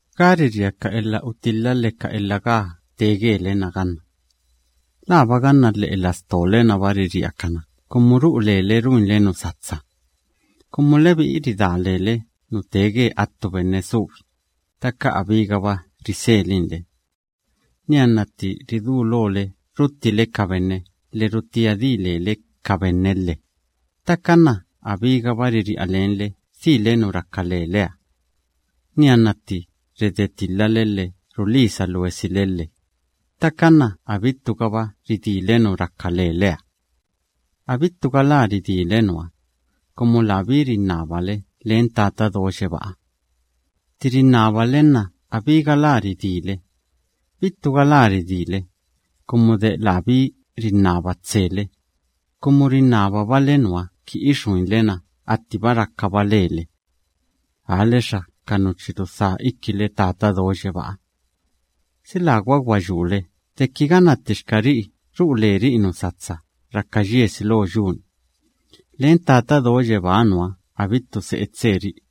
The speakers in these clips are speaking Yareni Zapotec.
¿Gá riria ka elha utilha lhe ka elha gaa tee gele‑na ganna? ¿Laaba ganna lhe'e lastole‑naba riria ka nuná kumu ru'u lele ruinle nu satsa? Kumu lebi'i ridá lele nu tee ge attu benne subi, ttaka abígaba riselinle. Nianna tti ridulole ruttile ka benne lhe rutía di lele ka benne lhe, ttaka nna abígaba riri'a lenle dhile nu raka leleha. Nianna tti redetilhale lhe rulisa luesile lhe, ttaka nna abittugaba ridíle nu raka leleha. Abittu galá ridíle nuha, kumu labí rinnabale len Tata Do Yebáha. Tti rinnabale nna abí galá ridíle. Bittu galá ridíle, kumu de labí rinnaba tsele, kumu rinnababale nuha ki ixuinle na attiba rakaba lele. Aalexa ka nu chi rudhá ikile Tata Do Yebáha. ¿Si lagwa gwa yule deki ganna ttixka ri'i ru'u leri'i nu satsa raka yiesi lo yu‑ni, len Tata Do Yebáha nuha abittu se'e tseri'i?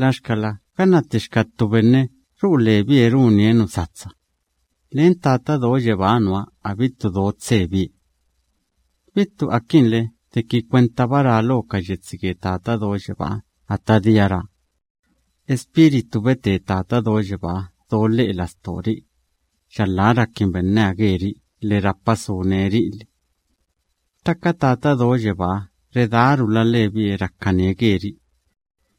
Laxkala ganna ttixka ttu benne ru'u lebie runie nu satsa, len Tata Do Yebáha nuha abittu do tsebie. Bittu akinle deki kwentaba ra lo ka yetsi ge Tata Do Yebáha ata dia ra: “Espíritu bete Tata Do Yebáha do lhe'e lastori'i, yalhá rakin benneha geri'i lhe rapa sune ri'i lhe.” Ttaka Tata Do Yebáha redárula lebie rakanie geri'i.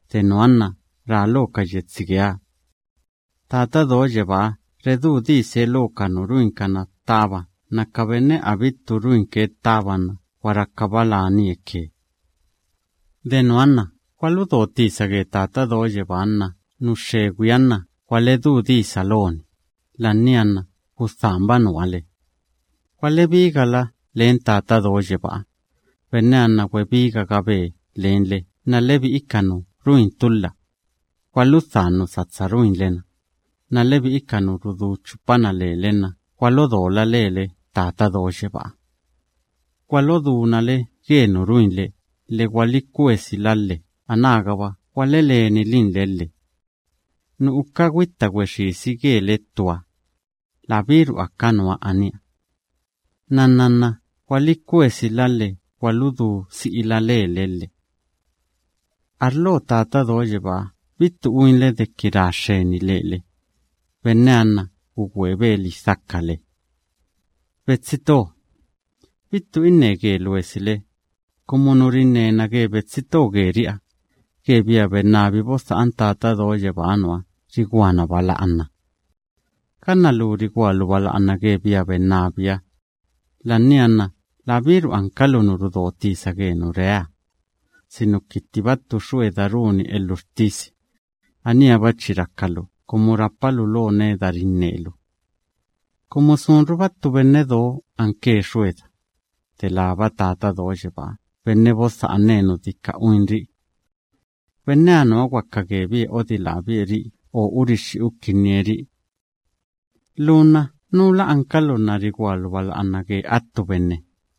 De nuha nna ra lo ka yetsi geeha: “Tata Do Yebáha redú dise lo ka nu ruinkana ttaba nna ka benne abittu ruinke ttaba nna gwa rakaba lanie ke.” De nuha nna gwaludo tisa ge Tata Do Yebáha nna nu xxegwiha nna gwaledú disa loni. La'ania nna gudhanba nuha le. Gwalebigala len Tata Do Yebáha, benneha nna gwebigagabe lenle nna lebi'i ka nu ruin tulha, gwaludhan nu satsa ruinle‑na, nna lebi'i ka nu rudú chupana lele nna gwalodola lele Tata Do Yebáha. Gwalodúna le ge nu ruinle lhe gwalikwesila lhe, anágaba gwalelenilinle lhe. Nu uka gwitta gwexisi gele ttuha, labíru aka nuha aníha. Nnanna nna gwalikwesila lhe gwaludú si'ila lele lhe. Arlo Tata Do Yebáha bittu uinle deki ra xxeni lele, benneha nna gugwebe lidhakale. Betsi to, bittu inne ge luesile, kumu nu rinnena ge betsi to geri'iha, ge bia bennabi bodha'an Tata Do Yebáha nuha riguana bala'ana. Ganna lu rigualu bala'ana ge bia bennabiha, la'ania nna labíru ankalu nu rudo tisa ge nu reeha, sinuki ttiba ttu xueda runi elhuxtisi, aníha‑ba chi rakalu kumu de rapalu lo neda rinnelu. Kumu sunruba ttu benne do anke xueda, delába Tata Do Yebaa benne bodha'ane nu dika uinri'i. Benneha nuha gwaka gebie odilábie ri'i o urixxi ukinnie ri'i. Lu nna, ¿núla ankalu nna rigualu bala'ana ge attu benne?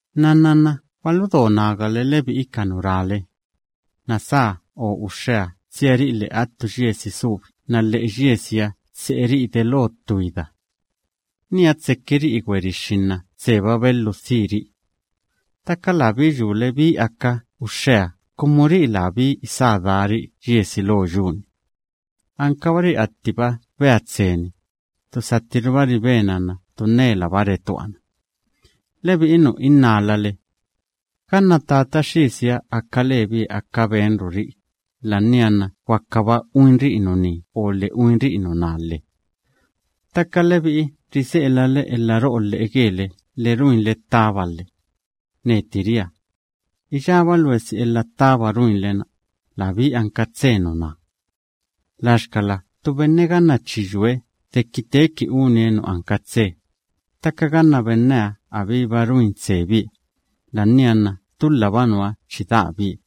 Nnanna nna gwaludo nagale, lebi'i ka nu rale: “Nasá o uxxeha tsiari'i lhe'e attu yiesi subi nna lhe'e yiesiha tse'eri'i delo ttu ida. Niha tsekiri'i gwerixxi nna tseba belhiu dhiri'i.” Ttaka labí yule bí aka uxxeha kumu ri'i labí isá dari'i yiesi lo yu‑ni. Ankabari'i attiba bea tseni, ttu sattiruba ribena nna ttu nnelaba retuana. Lebi'i nu innálale: “Ganna Tata Xisiha aka lebie aka benruri'i, la'ania nna gwakaba uinri'i nuní o lhe uinri'i nuná lhe.” Ttaka lebi'i rise'elale elha ro'o lhe'e gele lhe ruinle ttaba lhe. Neti ria: “Iyába luesi elha ttaba ruinle‑na, labí anka tse nuná.” Laxkala ttu benne ganna chi yue deki teeki unie nu anka tse, ttaka ganna benneha abíba ruin tsebie, la'ania nna tulhaba nuha chi daabie.